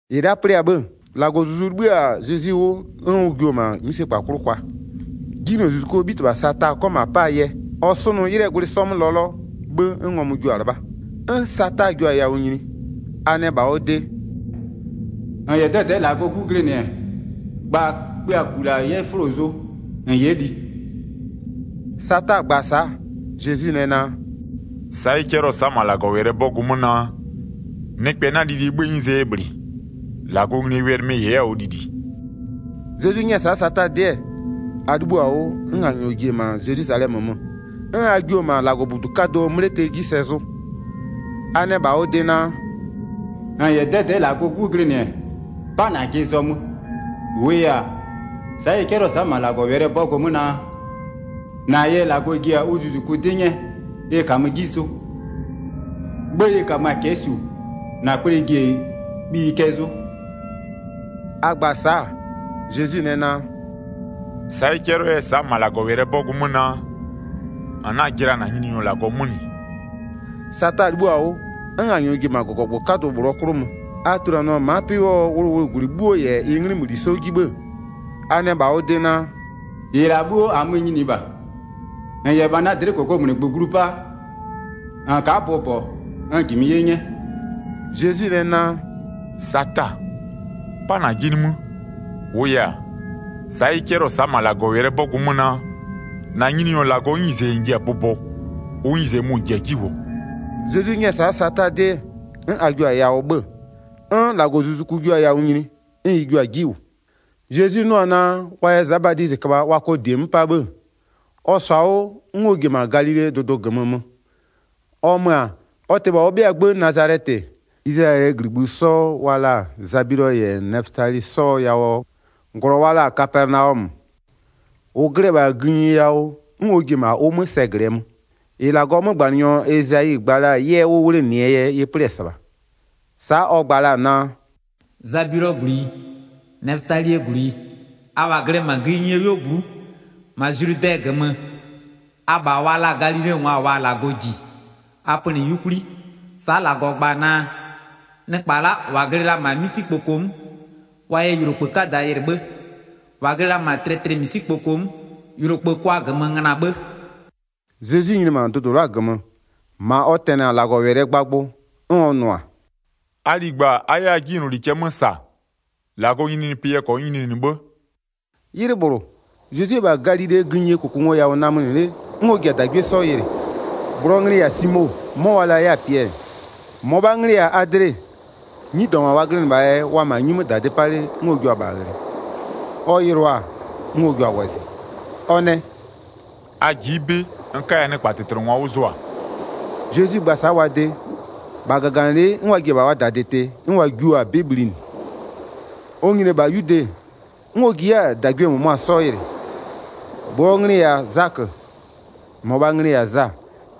1-Ɩ la'a 'plɩ-a 'bhë, -Lagɔɔ Zuzu 'libhï-a Zezwi 'wʋ 'n ʋ jio-o -ma 'mïsekpa 'klʋ kwa, 'jinylozuzukuo 'bhitɩbha Sata 'kɔ -ma 'paa yɛ. Ɔ 'sʋnʋ 'ylɩɛ gwlɩ 'sɔ 'mö lɔlɔ, 'bhë 'n ngɔmʋ jio-a 'lɩbha. 'N Sata jio-a yawʋ nyini, a nɛ -bha ɔ de: “-N -yɛ 'dɛdɛ'ɛ -Lagɔɔ 'Gu glɩnɩ-ɛ, gba kpïaku -la 'yɛ 'fʋlo zʋ -n 'yɛ li.” Sata gba-a sa'a, Zezwi nɛ naa: “Sa'a ɩ 'cɛlɩɔ-ɔ sa'a -ma -Lagɔwɛlɩɛ 'bɔgʋ 'mö naa: Nɩkpɛ 'na lilie 'bhëë 'nyizee yɛ -bhlɩ. -Lagɔɔ nglie wɛlɩ mɩ-ɩ -yɛ 'yɛ-a ɔ lili.” Zezwi 'nyɛ-ɛ sa'a Sata 'dɩ-ɛ, a 'libhïo-a 'wʋ 'n a -nyɔɔ ji-e -ma Zelwizalɛmö mö, 'n a jio-o -ma -Lagɔbudu 'kadʋɔ 'mlete 'ji sɛ zʋ. A nɛ -bha ɔ de naa: “-N -yɛ 'dɛdɛ'ɛ -Lagɔɔ 'Gu glɩnɩ-ɛ, 'pa -najɩ zɔmö, -wʋʋ yɛ-a, sa'a ɩ 'cɛlɩɔ-ɔ sa'a -ma -Lagɔwɛlɩɛ 'bɔgʋ 'mö naa: -Na yɛ -Lagɔ ji-a ʋ zuzuku 'dɩ 'nyɛɛ ɩ -kamö 'ji zʋ, 'bhë ɩ -kamö-a cɛ'ɛ -su -na kple ji-e kpiyi gozo.” A gba-a sa'a, Zezwi nɛ naa: “Sa'a ɩ 'cɛlɩɔ 'yɛ-ɛ sa'a -ma -Lagɔwɛlɩɛ 'bɔgʋ 'mö naa: -N 'na-a jɩla -na Nyininyɔ -Lagɔ 'mö -nɩ.” Sata 'libhïo-a 'wʋ, 'n a -nyɔɔ ji-e -ma -gɔgɔgbʋ 'kadʋ -bhlʋ 'klʋ mö. A tuluanɩɔ-a ma'a 'pɩ 'wʋɔ wʋlʋwʋlʋgwlɩ 'bhuo -yɛ ɩ 'nglɩmöli 'sɔ 'ji 'bhë-ë, a nɛ -bha ɔ de naa: “-Ɩ -la 'bhuo, -amö-ö nyiniɩ -bha, -n -yɛ -bha na dlɩ'ɩ -kokomunigbö glu 'pa, -n ka'a bʋbɔ n -jimɩ 'ye 'nyɛ.” Zezwi nɛ naa: “Sata! 'Pa -najɩ nimï, -wʋʋ yɛ-a, sa'a ɩ 'cɛlɩɔ-ɔ sa'a -ma -Lagɔwɛlɩɛ 'bɔgʋ 'mö naa: -Na Nyininyɔ -Lagɔɔ 'nyize -n ji-a bʋbɔɔ, ʋ 'nyize mʋ -n ji-a 'ji -wʋɔ.” Zezwi 'nyɛ-ɛ sa'a Sata 'dɩ 'n a jio-a yawʋ 'bhö-ö. 'N -Lagɔzuzuku jio-a yawʋ nyini, 'n ɩ jio-a 'ji -wʋ. Zezwi 'nʋ-ɔ naa, wa yɛ Za Badizɩ köbha wa kɔ -die 'mö 'pa 'bhë-ë, ɔ -sɔ-a 'wʋ 'n ɔ ji-e -ma Galilee dʋdʋ -gömö mö. Ɔ mö-a, ɔ tɩ -bha ɔ 'bhɩaa 'gbë Nazalɛtɩ, Izlayɛlɩɛ -gligbï 'sɔ wa la-a Zabilɔ -yɛ Nɛfötali 'sɔɔ yawʋɔ -glɔ wa la-a Kapɛnaɔmö, -ʋ glɩ-ɛ -bha gïnyi yawʋ, 'n ɔ ji-e -ma ʋ 'mö sɛ glɩɛ mö. 14-Ɩ -Lagɔɔ 'mögbanɩnyɔ Ezayi gba la-a 'yɛ 'wʋ 'wlenɩɛ yɛ ɩ 'plɩ-ɛ -sɩbha. Sa'a ɔ gba la-a naa: “Zabilɔɔ -gwlɩyi, Nɛfötalie -gwlɩyi, abha glɩ-ɛ -ma gïnyie 'yuogblʋ'ʋ, -ma Zludɛ -gömö abha wa la-a Galilengwa -waa -Lagɔ -ji, a pönɩ 'yukwli. Sa'a -Lagɔ gba-a naa: Nɩkpa la'a -wa glɩ la-a -ma 'misikpoko 'mö, wa yɛ yʋlokpë 'kada yɩlɩ 'bhë, -wa glɩ la-a -ma tlɩtlɩmisikpoko 'mö, yʋlokpë kʋa -gömö ngöna 'bhë.” Zezwi nyini-e -ma dʋdʋ la'a -gömö-ö, -ma ɔ tɛnɩ-a -Lagɔwɛlɩɛ gbagbʋ, 'n ɔ nʋ-a: “A ligba a 'yɛ a 'jinyloli cɛ 'mö -sa, -Lagɔɔ nyininyinipɩ yɛ -kɔnyɩ nyininɩ 'bhë.” 'Ylɩ -bhlʋ, Zezwi-e -bha Galilee gïnyie -kʋkʋngoyawʋ namönɩ 'le 'n ɔ ji-a -dagwie 'sɔ yɩlɩ. -Bhlʋɔ nglɩ-ɩ -yɛ-a Simo, 'mɔ wa la la 'yɛ-a Piɛlɩ, -mɔbhaa nglɩ-ɩ -yɛ-a Adle. 'Nyidɔngwa wa glɩnɩ -bhaa yɛ, wa-a -ma 'nyi 'mö -dadɩ 'pa 'le 'n ɔ jua-a -bha ghlɩ. Ɔ yɩlʋa-a, 'n ɔ jua-a wɔzɩ, ɔ nɛ: “A ji'i 'bɩ n 'kaya nɩkpatɩtlɩngwa 'wʋ zʋa.” Zezwi gba-a sa'a wa de, -bha -gaganɩlɩ'ɩ 'n wa ji-e -bha wa -dadɩ tɩ, 'n wa jio-a 'bɩ bhlinɩ. Ɔ nyini-e -bha 'yude, 'n ɔ ji 'yɛ-a -dagwie -mʋmʋa 'sɔ yɩlɩ. -Bhlʋɔ nglɩ-ɩ -yɛ-a Zakö, -mɔbhaa nglɩ-ɩ -yɛ-a Za,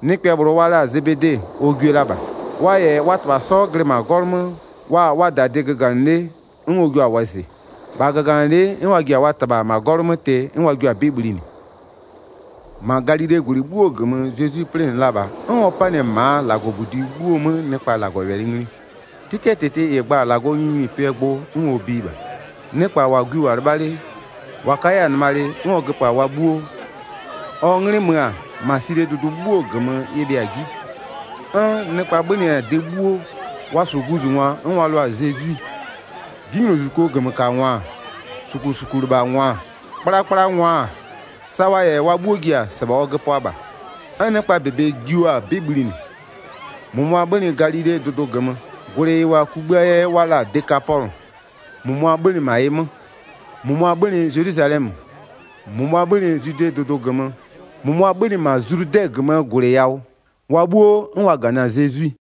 nɩkpɛ -bhlʋ wa la-a Zebede, ɔ gwie la -bha. Wa -yɛ wa -tɩbha 'sɔ glɩ -ma 'gɔlʋ 'mö wa-a wa -dadɩ göganɩ 'le, 'n ɔ jua-a wɔzɩ. 22-Bha -gaganɩlɩ'ɩ, 'n wa ji-e -ma wa -tɩbha 'gɔlʋ 'mö tɩ 'n wa jio-a 'bɩ bhlinɩ. 23-Ma Galilee -gwlɩ 'bhuo -gömö Zezwi 'plɩnɩ la -bha, 'n ɔ 'panɩ-ɛ -maa -Lagɔbudi 'bhuo 'mö nɩkpa -Lagɔwɛlɩ ngli. 'Tɩtɩɛ -tɩtɩ -ɩ gba-a -Lagɔɔ nyininyinipɩɛ gbʋ 'n ɔ biɩ -bha, nɩkpa -wa gwi -wʋ-a 'lɩbha 'le, -wa ka 'yɛ-a nɩmalɩ 'n ɔ göpö-a wa 'bhuo. Ɔ 'nglɩ mö-a, -ma Silie dʋdʋ 'bhuo -gömö ɩ bhɩa-a 'ji. 'N nɩkpa 'bhönɩ-a de 'bhuo, wa -su guzungwa 'n wa lʋa-a Zezwi. 'Jinylozuzukuo -gömökangwa-a, -sukusukulɩbhangwa-a, 'kplakplangwa-a, sa wa -yɛ wa 'bhuo ji-a -sɩbha ɔ göpʋa -bha. 'N nɩkpaa -bebe jio-a 'bɩ bhlinɩ. -Mʋmʋa 'bhönɩ Galilee dʋdʋ -gömö, -gwlɩ -ɩ -wʋ-a kugbïaa yɛ wa la-a Dekapɔlʋ -mʋmʋa 'bhönɩ -ma ɩ 'mö, -mʋmʋa 'bhönɩ Zelwizalɛmö, -mʋmʋa 'bhönɩ Zwidee dʋdʋ -gömö, -mʋmʋa 'bhönɩ -ma Zludɛ -gömöö -gwlɩ yawʋ, wa 'bhuo 'n wa -ganɩ-a Zezwi.